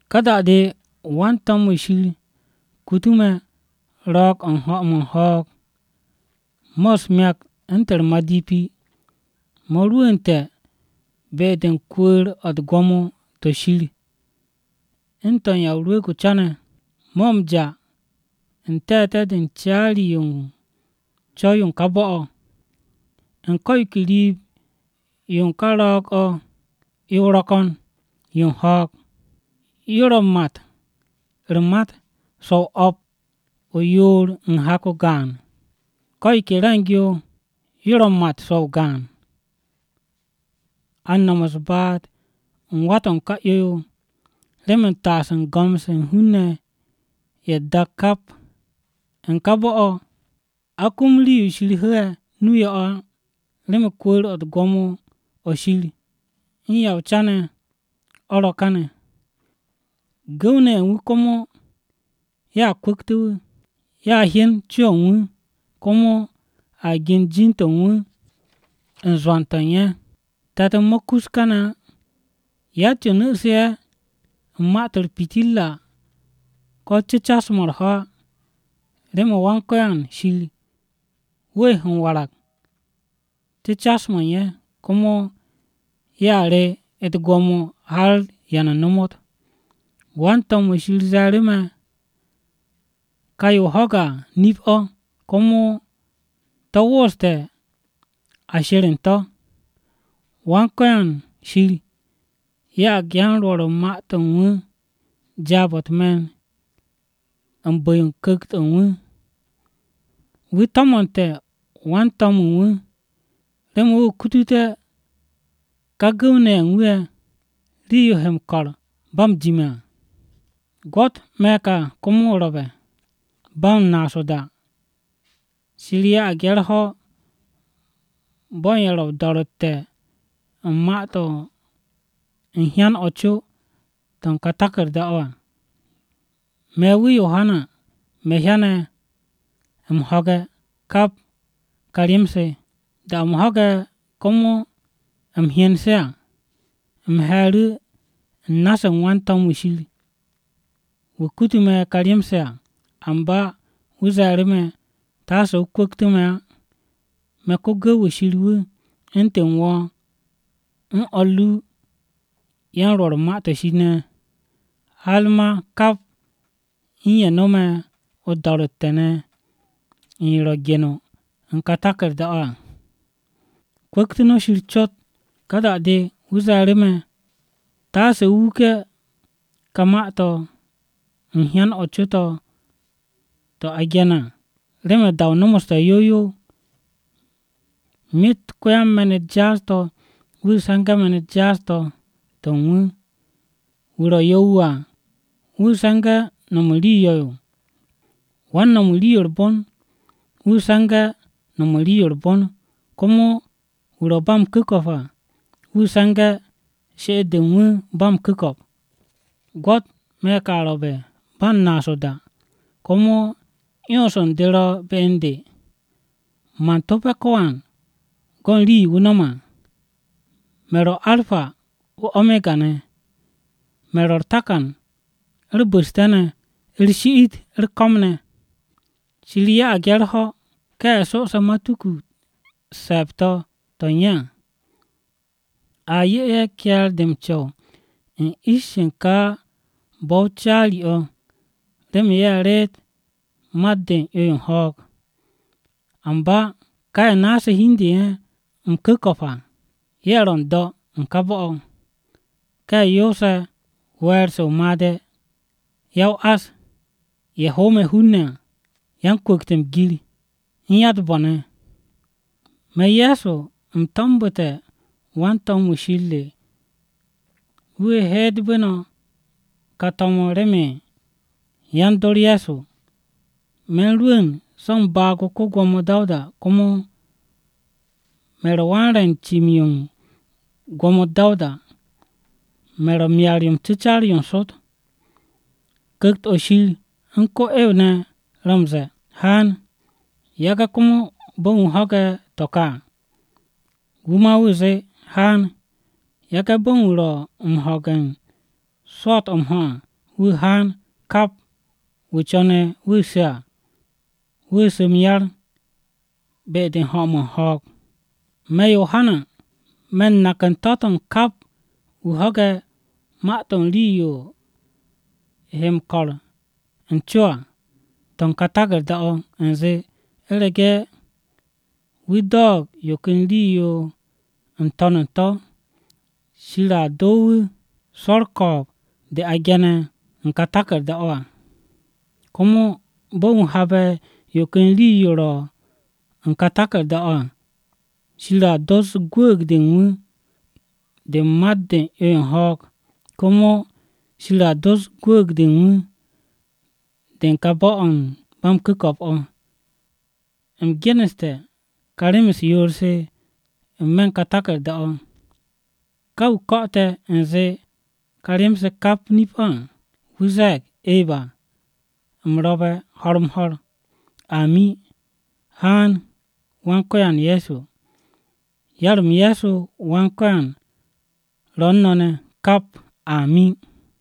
Ka da-de wan-to̱m-wu̱ Shir kutu me̱ ro̱o̱g-o̱ u̱n ho̱-mo̱ u̱n ho̱o̱g, mo̱ u̱s-myakt u̱ntu̱n u̱r-madipi mo̱ rwu̱u̱nte̱ be-de u̱n kwu̱u̱r-o̱ u̱t-gwo̱mo to̱ Shir u̱n to̱ u̱n Ya o-Rwu̱u̱g o-Ca ne̱. Mo̱ m-ja n-te̱te̱ de u̱n caari-yo u̱n co̱w-yo u̱n ka bo̱-o̱. U̱n ko̱ yo ke riib-yo ká ro̱o̱g-o̱ 'yo-o ro̱ ko̱n yo u̱n ho̱o̱g, yo ro̱ u̱n mat u̱r-mat so̱-o o̱p u̱n yoor hak gaan. Ko̱ yo ke re̱ng-yo yo ro̱ m-mat so̱-o gaan. A u̱n no̱m u̱s-baat u̱n wá-to̱ u̱n ka 'yo-yo remen taasté̱ u̱n go̱m-se u̱n hun-ne̱ ye̱ u̱t-dak kap. U̱n ká bo̱-o̱, a kum rii-yo Shir hu̱u̱ ye̱ nu-o yo̱-o̱ á, remen kwu̱u̱r-o̱ u̱t-gwo̱mo o̱ Shir u̱n Ya o-Rwu̱u̱g o-Ca ne̱ o̱ ro̱ káne̱. Gu̱w-ne̱ ye̱ u̱n wu̱ komo ye̱a kwu̱ktu̱ wu̱. Ye̱a hyen co-o̱ u̱n wu̱, komo a gen jin-de u̱n wu̱ u̱n zwo̱n-to̱ u̱n ye̱. Te̱t-m mo̱ kus kaane̱ á. Yatt-yo nu̱su̱ ye̱ u̱n ma-to̱ u̱r-pitirra ko̱ cu̱cas-mo̱ u̱r-ho̱ á, remen Wan-Ko̱yan Shir wu̱ he m-warag cu̱cas-mo̱ u̱n ye̱. Komo ye̱a re u̱t-gwo̱mo har da-o̱ ba m-ta. Wan-to̱m-wu̱ Shir ze̱e̱ru̱ me̱, “Ka yo o ho̱ge̱ à nip-o̱, komo to̱ wooste̱ a she̱r u̱n to̱. Wan-Ko̱yan Shir ya'ag yan-Rwo̱r u̱n ma-to̱ u̱n wu̱ jaab-o̱ u̱t-me̱n u̱n bu̱-yo Ku̱kt-o̱ u̱n wu̱. Wu̱ to̱mo̱nte̱ wan-to̱m o̱ u̱n wu̱, remen wu̱ kututé̱ ká gu̱w-ne̱ ye̱ u̱n wu̱ ye̱ rii-yo he m-ko̱r ba m-jime̱ à.” “Gwo̱t me̱ ka komo ro̱be̱, ba u̱n naas o-da! Shir ya'ag ye̱ u̱r-ho̱ bo̱ u̱n ye̱ ro̱ o-do̱ro̱tte̱ u̱n ma-to̱ u̱n hyan-o̱ co to̱ u̱n ka taku̱rda-o̱ à.” Me̱ wu̱ Yohana, me̱ hyane̱ u̱m ho̱ge̱, kap ka rem-se. Da-o̱ u̱m ho̱ge̱ komo u̱m hyen se à, u̱m he̱e̱ru̱ u̱n na-se u̱n wan-to̱m-wu̱ Shir, wu̱ kutu me̱ ka rem-se à. Amba wu̱ ze̱e̱ru̱ me̱, “Taase o kwu̱ktu̱ me̱ á! Me̱ ko-gu̱w-wu̱ Shir wu̱, u̱ntu̱n wo̱ u̱n o̱r ru ne̱ u̱n yan-Rwo̱r u̱n Ma-to̱ Shir, har ma kap u̱n ye̱ no̱me̱ do̱ro̱tte̱-o̱ u̱n yo ro̱ gene̱ ne̱ u̱n kà taku̱rda-o̱ à. Kwu̱ktu̱ no̱ Shir cot!” Ká da-de wu̱ ze̱e̱ru̱ me̱, “Taase o wuke̱ ka ma-to̱ u̱n hyan-o̱ co-o̱ to̱ gene̱ à, remen da-o nomoste̱ yow yow. Myet ko-yan-me̱n-u̱t jaas-to̱ wu̱ se̱nge̱ me̱n-u̱t jaas-to̱ to̱ u̱n wu̱, wu̱ ro̱ yo̱-wu̱ à, wu̱ se̱nge̱ no̱m u̱n rii yo̱-yo. Wan-no̱m u̱n rii-yo u̱r-bon, wu̱ se̱nge̱ no̱m u̱n rii-yo u̱r-bon, komo wu̱ ro̱ ba m-ku̱ko̱p á, wu̱ se̱nge̱ she'et-de u̱n wu̱ ba m-ku̱ko̱p.” “Gwo̱t, me̱ ka ro̱be̱ ba u̱n naas o-da! Komo 'yons u̱n de ro̱ be u̱n de, man to̱pe̱ ko̱wan go̱n rii-yo wu̱ no̱me̱ à. Me̱ ro̱ Arpa, u̱n Omega ne̱. Me̱ ro̱ u̱r-Takan u̱r-Bu̱ste̱ ne̱, u̱r-Shi'it u̱r-Ko̱m ne̱. “Shir 'ye ye̱ u̱r-ho̱ ká ye̱ so'ose̱ matuku-u̱t se̱e̱b-to̱ to̱ u̱n ye̱ à. A 'ye ye̱ ke̱e̱r-de m-co̱w u̱n ish-se u̱n ká bo̱-o caari-o̱ remen ye̱ reet mat-de u̱n 'yo-yo u̱n ho̱o̱g. Amba ká ye̱ muute̱ hi-de u̱n ye̱ ya-m-ku̱ko̱p à, ye̱ ro̱ n-do̱ u̱n ka bo̱-o̱: Ka ye̱ yoose̱ we̱e̱r-se o-made̱, Ya-o-ás, Ye̱ hoome̱ hun-ne̱ à, Yan-kwu̱kte̱ m-gir, u̱n Ya-u̱t-bo̱ ne̱. “Me̱, Ye̱so, u̱m to̱mbu̱te̱ wan-to̱m-wu̱ Shir re wu̱ heetbu̱ no̱ kà to̱m-o̱ remen yan-dor Ye̱so. Me̱ u̱n rwu̱u̱n so̱ u̱n baag-o ko-Gwo̱mo Dawuda komo me̱ ro̱ wan-re̱ u̱n cim-yo u̱n gwo̱mo-u̱t Dawuda. Me̱ ro̱ Myar-yo m-cu̱car yo n-Sot.” Ku̱kt-o̱ Shir u̱n ko-'ew ne̱ ro̱ m-ze̱e̱, “Haan!” Yage̱ komo bo̱ u̱n wu̱ ho̱ge̱ to̱ ka à, wu̱ ma wu̱ zee, “Haan!” Yage̱ bo̱ u̱n wu̱ ro̱ m-ho̱ge̱ u̱n swo̱o̱t-o̱ m-ho̱ à wu̱ haan: kap wu̱ co̱ne̱ wu̱ su̱ à, wu̱ su̱ m-yar be-de u̱n ho̱-mo̱ u̱n ho̱o̱g. Me̱, Yohana, me̱ u̱n nak u̱n to̱-to̱ u̱n kap wu̱ ho̱ge̱ ma-to̱ u̱n rii-yo he m-ko̱r u̱n co à to̱ u̱n ká taku̱rda-o̱ à u̱nze: U̱rege̱ wu̱ do̱o̱g yo ken rii-yo n-to̱n u̱n to̱, Shir a doo wu̱ swo̱ u̱r-ko̱o̱b de a ge̱ne̱ u̱n ka taku̱rda-o̱ à. Komo bo̱ u̱n wu̱ haabe̱ yo ken rii-yo ro̱ u̱n kà taku̱rda-o̱ à, Shir a dos gwu̱u̱g-de u̱n wu̱ de u̱n mat-de u̱n 'yo-yo u̱n ho̱o̱g. Komo Shir a dos gwu̱u̱g-de u̱n wu̱ de u̱n ká bo̱-o̱ o̱ u̱n ba m-ku̱ko̱p o̱. U̱m geneste̱ ka rem-u̱s yoor-se n-me̱ u̱n kà taku̱rda-o̱. Ká wu̱ ko̱'o̱te̱ u̱nze ka rem-se kap nip-o̱ à, wu̱ ze̱e̱g, “Eba, u̱m ro̱be̱ ho̱r-m-ho̱r!” Amin. Haan, Wan-Ko̱yan Ye̱so! Yar-m Ye̱so Wan-Ko̱yan ro̱ u̱n no̱ ne̱ kap! Amin!